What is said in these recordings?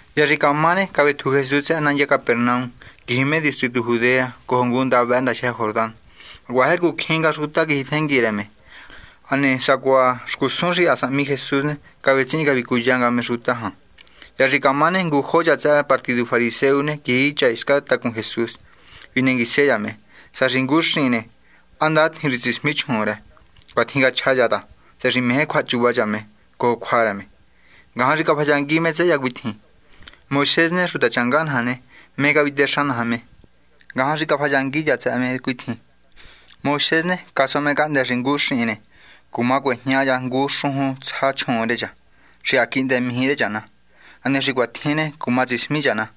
Hya xi camá ne, cavetju Jesús tsëhë nandya Capernaum quiji me distritu Judea cojo ngunda ndajyë Jordán. Hacuaha jercu cjín nga xuta quijitjengui rë me. Hane sacuaha xcusun xi ha sahmi Jesús ne, cavetsihin cavicuya nga me xuta jan. Hya xi camá ne, ngujo cha tsëhë partidu fariseo ne, quiji cha hiscan tacun Jesús. Vinenguise cha me tsëhë xi ngu xihin, ¿há ndatjin xi tsismi chjuun rë? Cuatjin cachja cha ta tsëhë xi meje cjuahachuva cha me cojo cjua rë me. Ngajan xi cafayangui me tsëhë cha cuitjin: ―Moisés ne, xutachanga naja ne, ¿mé cavitexa naja me? Ngajan xi cafayangui cha tsëhë me cuitjin: ―Moisés ne, casua me cahndë́ xi ngu xihin ne, cuma cuejña cha ngu xujun tsja chjuun rë cha xi ha quihndë mijí rë cha na. Hane xi cuatjin ne, cuma tsismi cha na.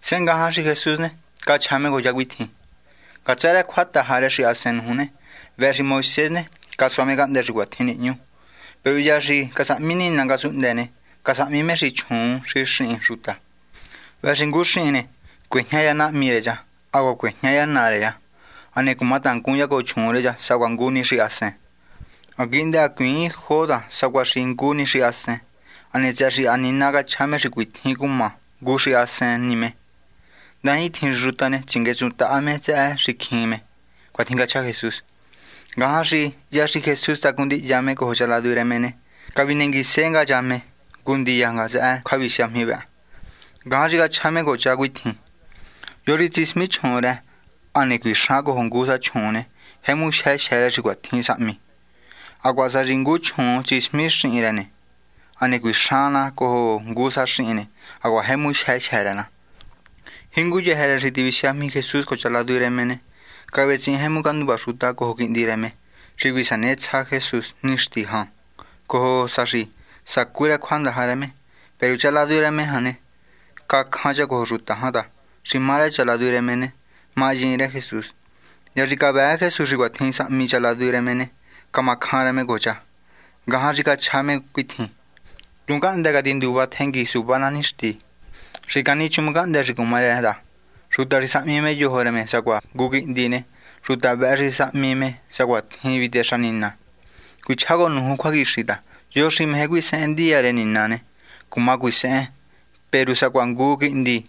Sehe ngajan xi Jesús ne, cachja me cojo cha cuitjin: ―Ngatsë rë cjuataja rë xahasen nuju ne, vëhë xi Moisés ne, casua me cahndë́ xi cuatjin nihñu. Peru hya xi casahmi Nina ngasunhndë ne: “Casahmi me xi chjuun xi xihin xuta.” “Vëhë xi ngu xihin ne, cuejña cha nahmi rë cha, hacuaha cuejña cha naa rë cha, hane cumatangun cha cojo chjuun rë cha sacuaha ngu ni xahasen.” Ha quihndë hacuiin jo ta sacuaha xi ngu ni xahasen. Hane tsëhë xi ha Nina cachja me xi cuatjin cuma ngu xahasen me ne, ndajintjin xi xuta ne, tsinguetsuntaha me tsëhë xicjin me. ―Cuatjin cachja Jesús. Ngajan xi hya xi Jesús tacun ndihya me cojo cha ladu rë me ne, cavinenguise nga cha me ngu ndiya tsëhë cjuavisiajmi vëhë. Ngajan xi cachja me cojo cha cuitjin: ―Yo xi tsismi chjuun rë hane cuixan cojo ngu sa chjuun ne, jemu jyë jyë́ rë xi cuatjin sahmi. Hacuaha sá xi ngu chjuun tsismi na xihin rë na hane cuixan na cojo ngu sa xihin ne, hacuaha jemu jyë jyë́ rë na. Jinguyëjë rë xi tivisiajmi Jesús cojo cha ladu rë me ne, cavetsihin tjemu canduva xuta cojo quihndi rë me, xi cuisanetsja Jesús nixti jan cojo sa xi sacú rë cjuandaja rë me. Peru cha ladu rë Jesús jan ne, cacjan cha cojo xuta jan ta, xi má rë cha ladu rë me ne, mahyiin rë Jesús. Hya xi cavëë Jesús xi cuatjin sahmi cha ladu rë me ne, camacjan rë me cojo cha. Ngajan xi cachja me cuitjin: ―Tuhun cahndë́ catinduva tjengui suva ná nixti. Xi canichuun cahndë́ xi cuma rë ta, xuta xi sahmi me yojo rë me sacuaha ngu quihndi ne, xuta vëhë xi sahmi me sacuatjin vitexa Nina. Cuichjá cojo nuju cjuaquixi ta yo xi meje cuisehen gubiernu rë Nina ne, cuma cuisehen peru sacuaha ngu quihndi.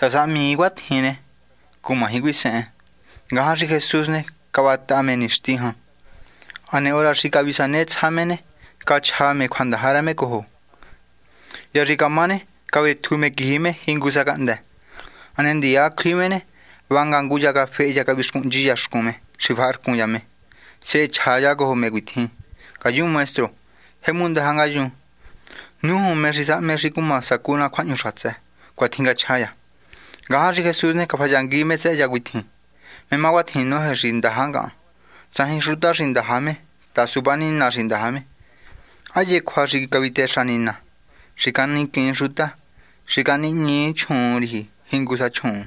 Sá sahmii cuatjin ne, cumaji cuisehen. Ngajan xi Jesús ne, cavataha me nixti jan. Hane hora xi cavisanetsja me ne, cachja me cjuandaja rë me cojo. Hya xi camá ne, cavetju me quiji me jingu sa cahndë́. Hane ndiya cjui me ne, vanga ngu cha cafehe cha cavixcuhnchi cha xcun me xi faharcun cha me. Sehe chja cha cojo me cuitjin: ―Ngayun maestro. Jemu ndaja ngayun. Nújun, ¿mé xi sahme xi cuma sacú ná cjuahñu xatsë? ―Cuatjin cachja cha. Ngajan xi Jesús ne, cafayangui me tsëhë cha cuitjin: ―¿Mé má cuatjin noje xi ndaja ngahan? Tsajin xuta xi ndaja suva ni Nina xi ndaja me. Ha hye cjua xi cavitexa Nina: “Xi caniquiin xuta. Xi canihñii chjuun nahñu riji jingu sa chjuun.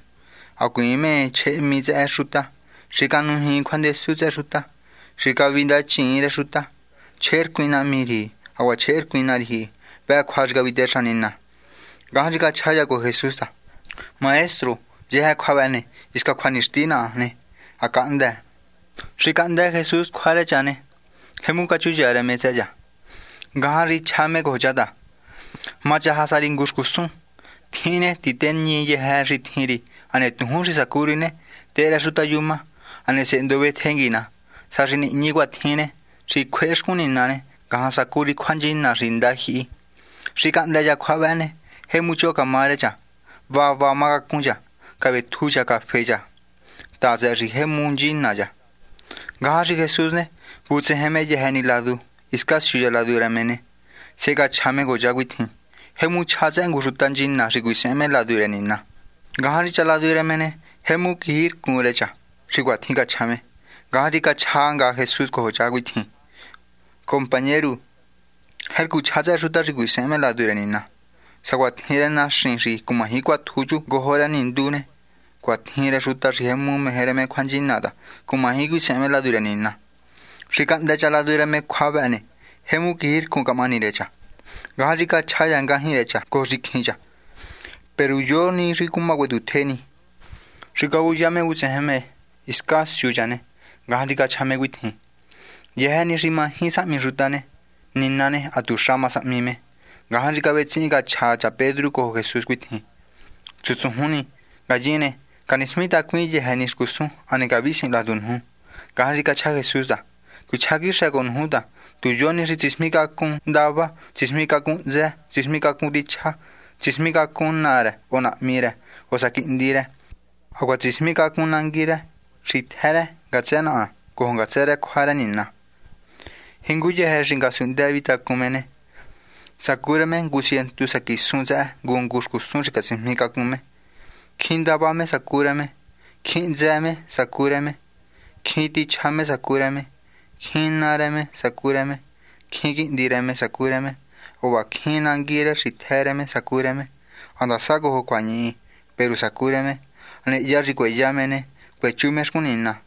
Hacuiin mé chjehehmi tsëhë xuta. Xi canujiin cjuandesu tsëhë xuta. Xi cavindachiin rë xuta. Chjehercuin nahmi riji hacuaha chjehercuin ná riji.” Vëhë cjua xi cavitexa Nina. Ngajan xi cachaja cha cojo Jesús ta: ―Maestro, yëjë cjua vëhë ne, hisca cjuanixti naha ne, ha cahndë. Xi cahndë Jesús cjua rë cha ne, jemu cachuya rë me tsëhë cha. Ngajan xi chja me cojo cha ta: ―Machaja sa ri ngu xcusun. Tjihin ne, titeñi yëjë xi tjin ri hane tujún xi sacu ri ne, tehe rë xuta yuma. Hane sehe ndovetjengui ná. Sá xi nihñi cuatjin ne, xi cjuehe xcun Nina ne, ngajan sacú ri cjuanchina xi ndajyihi. Xi cahndë cha cjua vëhë ne, jemu choho camá rë cha. Va va má cacun cha, cavetju cha cafe cha ta, tsëhë xi jemu nchina cha. Ngajan xi Jesús ne, vutsejen me yëjë ni ladu hiscan siu cha ladu rë me ne, sehe cachja me cojo cha cuitjin: ―Jemu chja tsëhë ngu xuta nchina xi cuisehen me ladu rë Nina. Ngajan xi cha ladu rë me ne, jemu quijircun rë cha xi cuatjin cachja me. Ngajan xi cachja nga Jesús cojo cha cuitjin: ―Compañeru, jercu chja tsëhë xuta xi cuisehen me ladu rë Nina. Sacuatjin rë naxin xi cumaji cuatju chu ngojo rë nindu ne, cuatjin rë xuta xi jemu meje rë me cjuanchina ta, cumaji cuisehen me ladu rë Nina. Xi cahndë cha ladu rë me cjua vëhë ne, jemu quijircun camahani rë cha. Ngajan xi cachja cha ngajñi rë cha cojo xicjin cha: ―¿Peru yo ni xi cuma cuetjutje ni? Xi cavuya me vutsejen me hiscan siu cha ne, ngajan xi cachja me cuitjin: ―Yëjë ni xi maji sahmi xuta ne, Nina ne, hatuxa ma sahmi me. Ngajan xi cavetsihin cachja cha Pedru cojo Jesús cuitjin: ―Chutsujun ni. Ngayin ne, canismitacuin yëjë ni xcusun, hane cavisihin ladu nuju. Ngajan xi cachja Jesús ta: ―Cuichjá quixë cojo nuju ta, tu yo ni xi tsismicacun ndava, tsismicacun hntsë, tsismicacun tichja, tsismicacun naa rë o sá nahmi rë o sá quihndi rë, hacuaha tsismicacun nangui rë xitjë rë ngatsë naha cojo ngatsë rë cjua rë Nina ne, jinguyëjë rë xi ngasunhndë vihi tacun me ne, sacú rë me ngu cientu sa quisun tsëhë ngu ngu xcusun xi catsismicacun me. Cjín ndava me sacu rë me. Cjín hntsë me sacu rë me. Cjín tichja me sacu rë me. Cjín naa rë me sacú rë me. Cjín quihndi rë me sacú rë me. Hacuaha cjín nangui rë xitjë rë me sacu rë me. Handasa cojo cjuañihi, peru sacú rë me. Hane hya xi cueya me ne, cuechú me cjuahñu xatsë xcun Nina.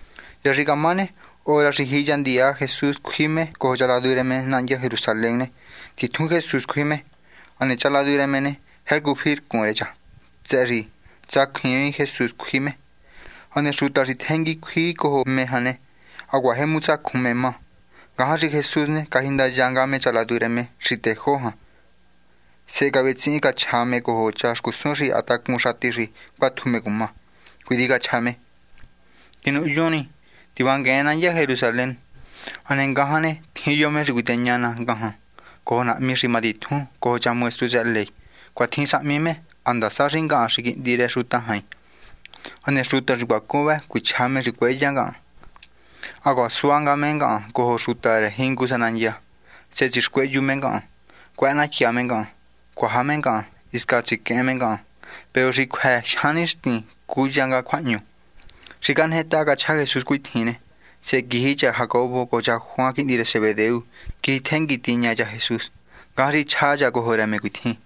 Hya xi camá ne, hora xi jiya ndiya Jesús cjui me cojo cha ladu rë me nandya Jerusalén ne, titjun Jesús cjui me. Hane cha ladu rë me ne, jercu fircun ra, tsëhë xi tsacjuiin Jesús xi cjui me. Hane xuta xi tjengui cjui cojo me jan ne, hacuaha jemu tsacjun me má. Ngajan xi Jesús ne, cajindaya nga me cha ladu rë me xi tejó ni jan, sehe cavetsihin cachja me cojo cha xcusun xi ha tacun xati xi cuatju me cuma. Cuitjin cachja me: ―Tinuhyun ni, tivanguen nandya Jerusalén. Hane ngajan ne, tjin yo me xi cuiteña ná ngajan cojo nahmi xi matitjun cojo cha maestru tsëhë ley. Cuatjin sahmi me ha ndasa xi ngahan xi Quihndi rë Xuta Jain. Hane xuta xi cuacun vë cuichja me xi cueya ngahan, hacuaha sua nga me ngahan cojo xuta rë jingu sa nandya. Sehe tsixcuehyu me ngahan. Cuëhënatya me ngahan, cuaja me ngahan, hisca tsiquehen me ngahan. Peru xi cjuë jyan nixtin ne, cúya nga cjuahñu. Xi cajnetaha cachja Jesús cuatjin ne, sehe quiji cha Jacobo cojo cha Juan, quihndi rë Zebedeo, quiji tjengui tiña cha Jesús. Ngajan xi chja cha cojo rë me cuitjin: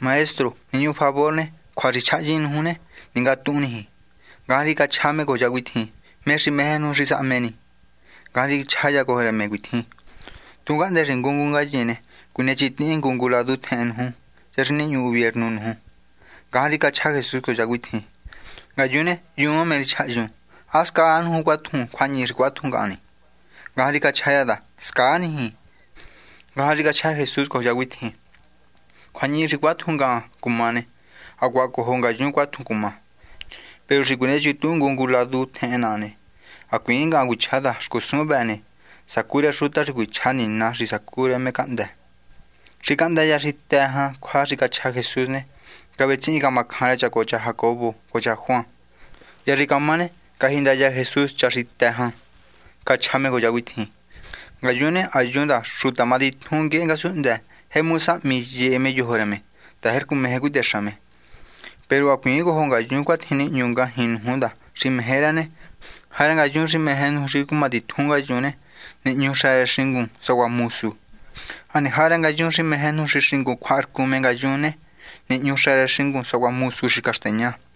―Maestro. Nihñu favor ne, cjua xi chjahyin nuju ne, ningatuhun niji. Ngajan xi cachja me cojo cha cuitjin: ―¿Mé xi meje nuju xi sahme ni? Ngajan xi chja cha cojo rë me cuitjin: ―Tuhun cahndë́ xi ngu ngu ngayin ne, cuinechintihin ngu ngu ladu tjehen nuju, hya xi nihñu gubiernu nuju. Ngajan xi cachja Jesús cojo cha cuitjin: ―Ngayun ne, hyuun mé xi chahyun. ¿Há scaa nuju cuatju cjuañihi xi cuátju ngahan ni? Ngajan xi cachja cha ta: ―Scaa niji. Ngajan xi cachja nga Jesús cojo cha cuitjin: ―Cjuañihi xi cuatju ngahan cumá ne, hacuaha cojo ngayun cuatjun cumá. Peru xi cuinechuntuhun ngu ngu ladu tjehen naha ne, hacuiin ngahan cuichjá ta xcusun vëhë ne, sacu rë xuta xi cuichja Nina xi sacu rë me cahndë́. Xi cahndë cha xi të jan cjua xi cachja Jesús ne, cavetsihin camacjan rë cha cojo cha Jacobo cojo cha Juan. Hya xi camá ne, cajindaya Jesús cha xi të jan ne, cachja me cojo cha cuitjin: ―Ngayun ne, ha hyun ta xuta matitjun nguehe ngasunhndë jemu sahmi yehe me yojo rë me, ta jercu meje cuitexa me. Peru hacuiin cojo ngayun cuatjin nihñu ngajñi nuju ta xi meje rë ne, jarë ngayun xi meje nuju xi cumatitjun ngayun ne, nihñu xa rë xingun sacuaha mosu. Hane jarë ngayun xi meje nuju xi xingun ne, cjuaharcun me yun ne, nihñu xa rë xingun sacuaha mosu xi caxteña.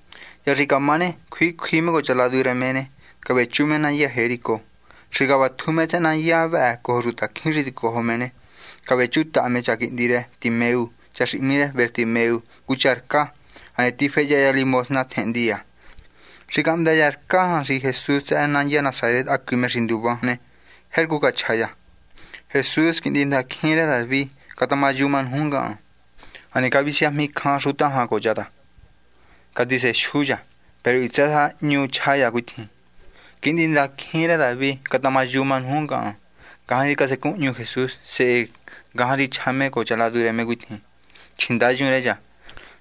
Hya xi camá ne, cjui cjui me cojo cha ladu rë me ne, cavechu me nandya Jericó. Xi cavatju me tsëhë nandya vëhë cojo xutacjín xi ticojo me ne, cavechutaha me cha quihndi rë Timeu, cha xi hmí rë Bartimeo, ngu cha rcá, hane tifehya cha caridad tjehen ndiya. Xi cahndë cha rcá jan xi Jesús tsëhë nandya Nasaret hacui me xi nduva me, jercu cachja cha: ―Jesús, quihndindaicjin rë David, catamayuma nuju ngahan. Hane cavisiajmicjan xuta jan cojo cha ta, catisejyu cha. Peru hitsë sa hñu chja cha cuitjin: ―Quihndindaicjin rë David, catamayuma nuju ngahan. Ngajan xi casecunhñu Jesús. Sehe ngajan xi chja me cojo cha ladu rë me cuitjin: ―Chjindayun rë cha.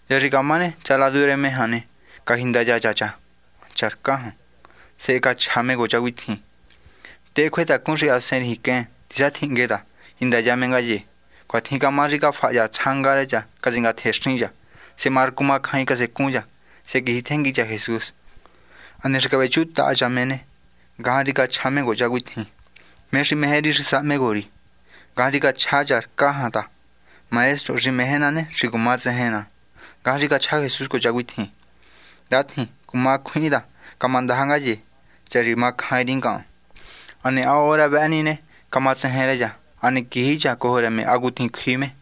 Hya xi camá ne, cha ladu rë me jan ne, cajindaya cha cha rcá jan, sehe cachja cha cojo cha cuitjin: ―Tehe cjuetacun xahasen riji quen. Tisatjinhngue ta, jindaya me ngaye. Cuatjin camá xi cafaha cha tsjanga rë cha catsingatjenxin cha. Sehe marcu macjain casecun cha. Sehe quijitjengui cha Jesús. Hane xi cavechutaha cha me ne, ngajan xi cachja me cojo cha cuitjin: ―¿Mé xi meje ri xi sahmi cojo ri? Ngajan xi cachja cha rcá jan ta: ―Maestro, xi meje ná ne, xi cuma tsejen ná. Ngajan xi cachja Jesús cojo cha cuitjin: ―Ndatjin. Cuma cjuihin ta, camandaja ye, tsëhë xi camacjain ri ngahan. Hane ha hora vëhë ni ne, camatsejen rë cha. Hane quiji cha cojo rë me hacutjin cjui me.